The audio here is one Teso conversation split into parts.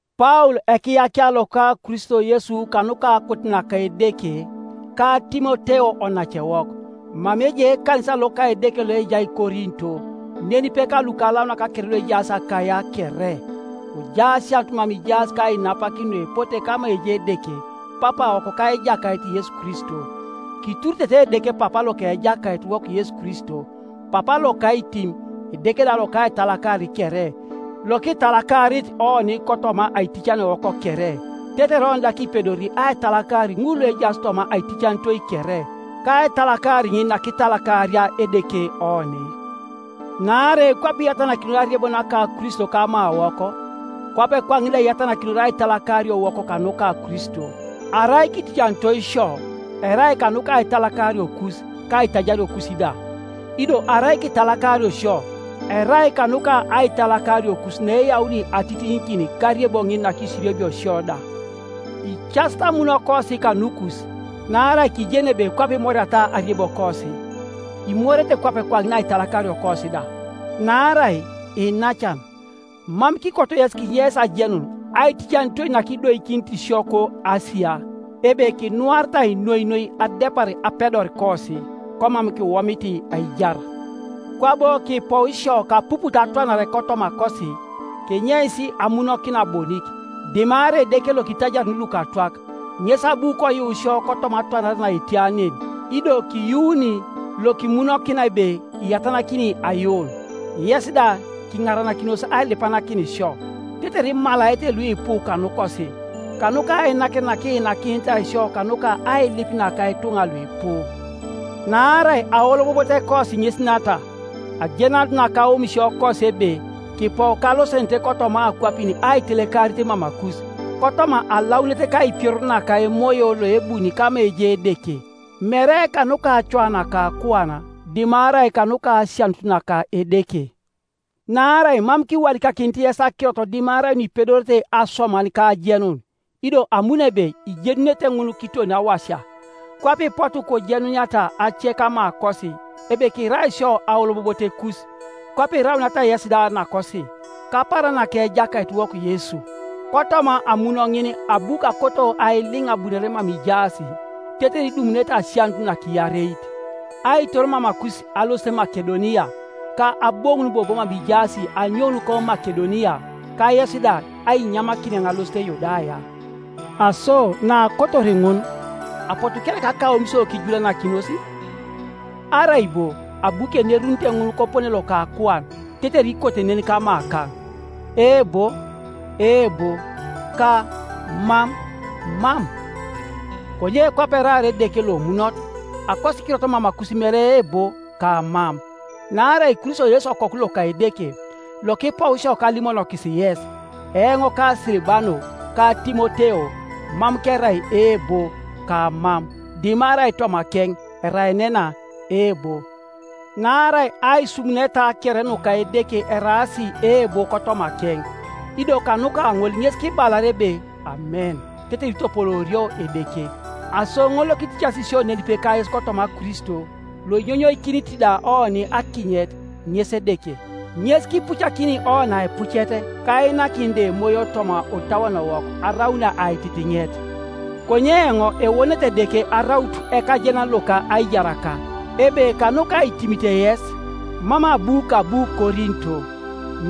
Paul ekiyakia loka Kristo Yesu kanuka akot naka Edeke, ka Timoteo onacewok, Mama ejai ekanisa loka Edeke loejai Korinto, nenipe ka lukalaunak kere luejaas Akaia kere: Kojai asianut mama ijaas ka ainapakin nuepote kama ejai Edeke Papawok ka Ejakait Yesu Kristo. Kituritete Edeke Papa loka Ejakaitiwok Yesu Kristo, Papa loka aitim, Edeke da loka aitalakar kere, lokitalakarit oni kotoma aiticanitoiwok kere, tetere oni da kipedori aitalakar ŋul luejaas toma aiticanitoi kere, kaitalakar ŋin nakitalakaria Edeke oni. Naarai kwape iyatanakinor ariebo naka Kristo kamawok, kwape kwaŋin da iyatanakinor aitalakariowok kanuka Kristo. Arai kiticanitoi sio, erai kanuka aitalakariokus ka aitajariokus da; ido arai kitalakario sio, erai kanuka aitalakariokus naeyauni atitiŋikin kariebo ŋin nakisiriebio sio da. Icasit amunokosi kanukus; naarai kijeni ebe kwape imoriata ariebokosi, imorete kwape kwaŋin aitalakariokosi da. Naarai, iinacan, mam kikoto yes kinyeis ajenun aiticanitoi nakidoikinit sio ko Asia, ebe kinuaritai noi noi adepar apedorikosi, komam kiwomit aijar. Kwabo kipou isio kapuput atwanare kotomakosi, kenyeis amunokina bonik, dimarai Edeke loitajaruni lukatwak; ŋes abu koyuu sio kotoma atwanare naetia nen, ido kiyuuni, lokimunokina ebe iyatanakini ayuun, Yes da kiŋarakinos ailipanakin sio, tetere imalaete luipu kanukosi, kanuka ainakinet nakiinakinitai sio kanuka ailip naka ituŋa luipu. Naarai aolobobotekosi ŋes nata, ajenanut naka aomisiokosi ebe kipou kalosenenete kotoma akwapin aitelekarit mamakus, kotoma alaunit ka aipioror naka emoyo loebuni kama ejai Edeke, mere kanuka acoa naka akuan, dimarai kanuka asianut naka Edeke, Naarai mam kiwadikakinit yes akirot dimarai nuipedorete asoman ka ajenun, ido amuno ebe ijenunete ŋun kiton awasia, kwape ipotu kojenuniata ace kamakosi, ebe kirai isio aolobobotekus, kwape irauniata yesi da nakosi, kapaaran naka Ejakaitiwok Yesu. Kotoma amun ŋin abu kakoto ailiŋ abunore mama ijaas, tetere idumunete asianut nakiareit; aitor mamakus alosit Makedonia, ka aboŋun bobo mama ijaas anyoun ko Makedonia, ka yes da ainyamakin eoŋ alosit Yudaya. Aso naakotor ŋun, apotu kereka akaomisio kijulanakinos? Arai bo abu kenerunite ŋun kopone loka akuan, tetere ikote nen kamakaŋ, “Eebo, eebo,” ka “Mam, Mam”? Konye kwape eraar Edeke lomunot, akosikirot mamakus mere Eebo ka Mam. Naarai Kristo Yesu Okoku loka Edeke, lokipou isio kalimonokis yes, eoŋ ka Silibano ka Timoteo, mam kerai Eebo, ka Mam; dimarai tomakeŋ eraenena Eebo. Naarai aisumuneta kere nuka Edeke eraas Eebo kotomakeŋ, ido kanuka ŋol ŋes kibalar ebe Amen tetere itopoloorio Edeke. Aso ŋol lokiticasi sio nenipe kayes kotoma Kristo, loinyonyoikinit da oni akinyet, ŋes Edeke. Ŋes kipucakini oni aipucet, ka ainakin da Emoyo toma otauonowok araun aititiŋet. Konye eoŋ ewonet Edeke araut ekajenan loka aijaraka, ebe kanuka aitimit yes, mam abu kabu Korinto.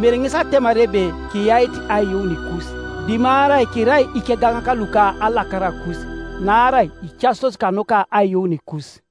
Mere ŋes atemar ebe kiyait aiyuunikus, dimarai kirai ikegaŋak luka alakarakus, naarai icasitos kanuka aiyuunikus.